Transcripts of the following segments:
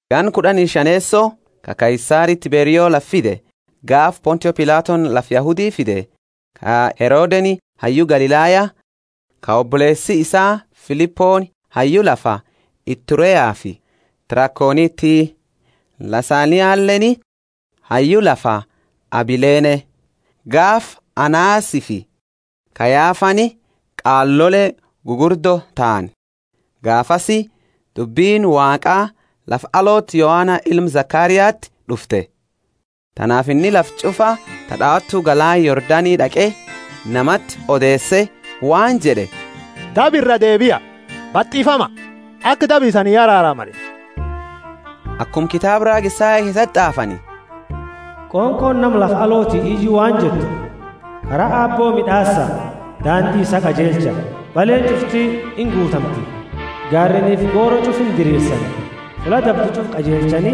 Ganna kud'ani shaneeso ka Kaisari Tiberioni lafa fide, gaafa Pontio Pilatoni lafa Yahudi fide, ka Herodeni hayyu Galilaya, ka oboleesi isaa Filiponi hayyu lafa Itureafi Trakoniti, Lisanialeeni hayyu lafa Abilene, gaafa Anasifi Kayafani qaalole gugurdo tahani, gaafasi dubbini Waaqa lafa alooti Yohana ilma Zekariati d'ufte. Tanaafi inni lafa ch'ufa ta d'aawatu galaana Yordani d'aqe namati odeese waan jed'e, Daba iraa deebia, batifama, aka daba isani araaramani. Akuma kitaaba raaga Isaya keesati t'aafani: Qonqooni nama lafa alooti iyu waan jettu: Kara Aabbo mid'aasa, daandi isaa qajeelcha! Baleeni ch'ufti inguutamti, gaareenifi goro ch'ufa indirirsani; fulla dabdu ch'ufa qajeelchani,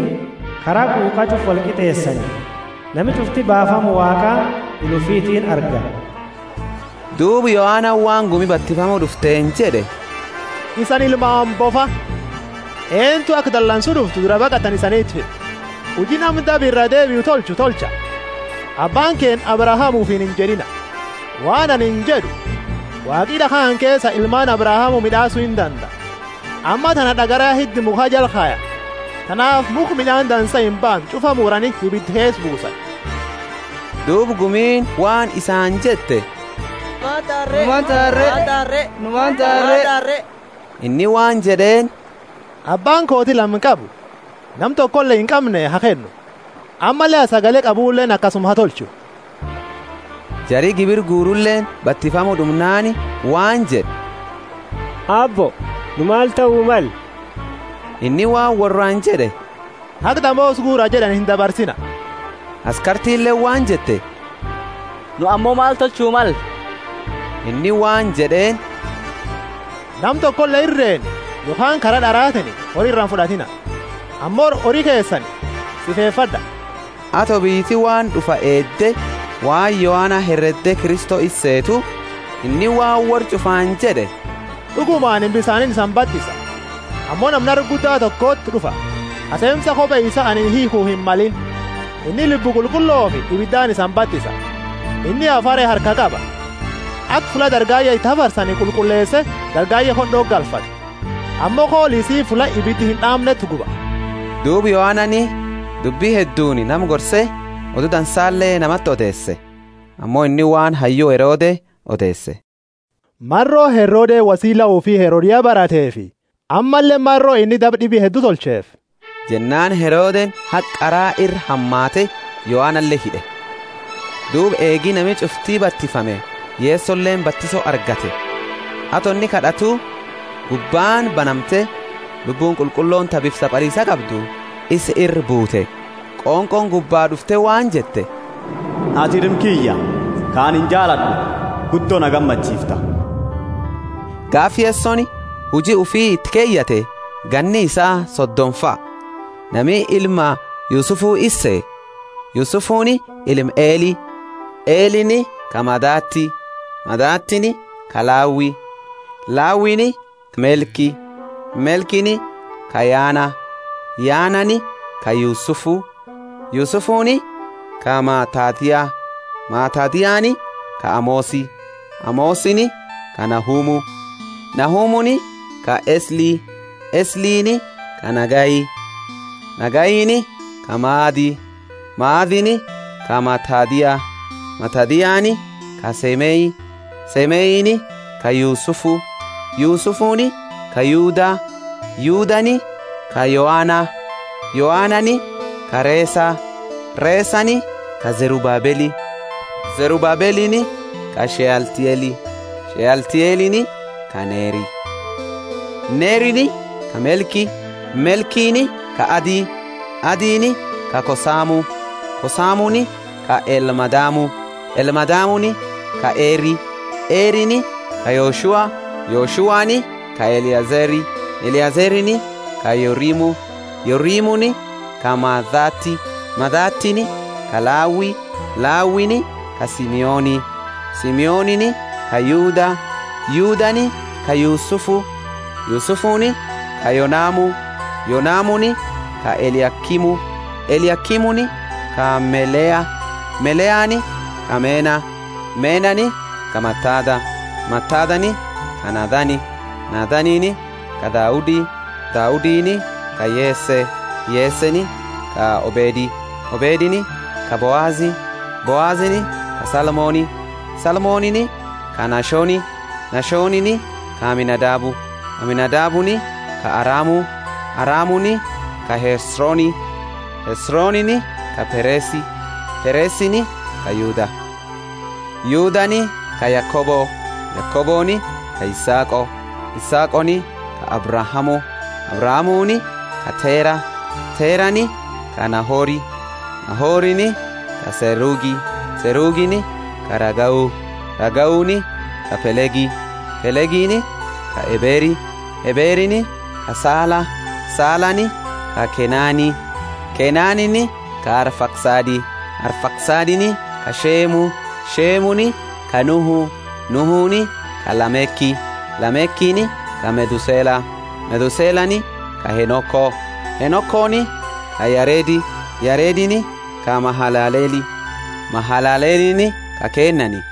kara quqaa ch'ufa wolqit'eesani. Nami ch'ufti baafama Waaqaa ila ufitiini arga. Duuba Yohanani waan gumi batifamu d'ufteeni jed'e, Isani ilmaani bofa! Eentu aka dalansu d'uftu duraa baqattani isaniti hime? Huji nami daba iraa deebiu tolchu tolcha. Abbaani keenna Abrahamu ufiini injed'ina. Waan anini jed'u, Waaqi d'akha kana keesa ilmaani Abrahamu mid'aasu indandaa. Ammaa tana d'agara ya hidda mukha jala kayani; tanaafi mukha mid'aani dansa imbaamne ch'ufa muraniti ibida keesa buusani. Duuba gumiini waan isaani jette, Nu maani taana re? Inni waan jed'eeni, Abbaani kooti lama qabu nama tokole inqamne ha kennu, ammalle ka sagale qabuleeni akasuma ha tolchu. Jari gibira guruleeni batifamu d'umnaani waan jed'e, Aabbo, nu maal tahu malle? Inni waan worraani jed'e, Haga damoosa guura jed'ani indabarsiina. Askartileeni waan jette, Nu ammo maal tolchu malle? Inni waan jed'eeni, Nama tokole irreeni yokhaani kara d'aratiini hori ira imfud'atiina; ammo hori isani kennanii sifefad'a. Ato biyyiti waan d'ufa eedde waan Yohana heredde Kristo isa seetu, inni waan worra ch'ufaani jed'e, D'uguma anini bisaaniini isani batisa, ammo nama nara gudda tokoti d'ufa ka seemsa kope isaa anini hiikhu himmalini. Inni Lubbu Qulqulloofi ibidaani isani batisa. Inni hafare harkaa qaba, aka fulla dargaye iti hafarsani qulqulleese dargaye khod'oti galfatu; ammo qoola isii fulla ibidi ind'aamneti guba. Duuba Yohanani dubbi hedduuni nama gorse Odu Dansale namati odeese. Ammo inni waan hayyu Herode odeese, maro Herodeni wosila ufi Herodia barateefi, ammalle maro inni daba d'ibi heddu tolcheefi. Jennaani Herodeni haga qara ira hamaate Yohanale hid'e. Duuba eegi nami ch'ufti batifame Yesoleeni batiso argate. Ato inni kad'atu, gubbaani banamte, Lubbuuni Qulqullooni ta bifa sabaliisa qabdu isa ira buute, qonqooni gubba d'ufte waan jette, Atini Ilma kiyya, ka anini jaalad'u, guddo na gammachiifta. Gaafa Yesoni huji ufi iti keyate ganni isaa sodomafa; nami ilma Yusufu isa sehe, Yusufuni ilma Eli. Elini ka Mathati, Mathatini ka Lawi, Lawini ka Melki, Melkini ka Yana, Yanani ka Yusufu, Yusufuni ka Maatathia, Maatathiani ka Amosi, Amosini ka Nahumu, Nahumuni ka Esli, Eslini ka Nagai, Nagaini ka Maathi, Maathini ka Matathia, Matathiani ka Semei, Semeini ka Yusufu, Yusufuni ka Yuda, Yudani ka Yoana, Yoanani ka Resa, Resani ka Zerubabeli, Zerubabelini ka Shealtieli, Shealtielini ka Neri, Nerini ka Melki, Melkini ka Adi, Adiini ka Kosamu, Kosamuni ka Elmadamu, Elmadamuni ka Eri, Erini ka Yoshua, Yoshuani ka Eliezeri, Eliezerini ka Yorimu, Yorimuni ka Mathati, Mathatini ka Lawi, Lawini ka Simeoni, Simeonini ka Yuda, Yudani ka Yusufu, Yusufuni ka Yonamu, Yonamuni ka Eliakimu, Eliakimuni ka Melea, Mealani ka Mena, Menani ka Matatha, Matathani ka Nathani, Nathanini ka Daudi, Daudini ka Yese, Yeseni ka Obedi, Obedini ka Boazi, Boazini ka Salmoni, Salmonini ka Nashoni, Nashonini ka Aminadabu, Aminadabuni ka Aramu, Aramuni ka Hesroni, Hesronini ka Peresi, Peresini ka Yuda, Yudani ka Yakobo, Yakoboni ka Isaaqo, Isaaqoni ka Abrahamu, Abrahamuuni ka Tera, Terani ka Nahori, Nahorini ka Serugi, Serugini ka Ragau, Ragauni ka Pelegi, Pelegini ka Eberi, Eberini ka Sala, Salani ka Kennani, Kennanini ka Arfaksadi, Arfaksadini ka Shemu, Shemuni ka Nuhu, Nuhuni ka Lameki, Lamekini ka Methusela, Methuselani ka Henoko, Henokoni ka Yaredi, Yaredini ka Mahalaleli, Mahalalelini ka Kennani,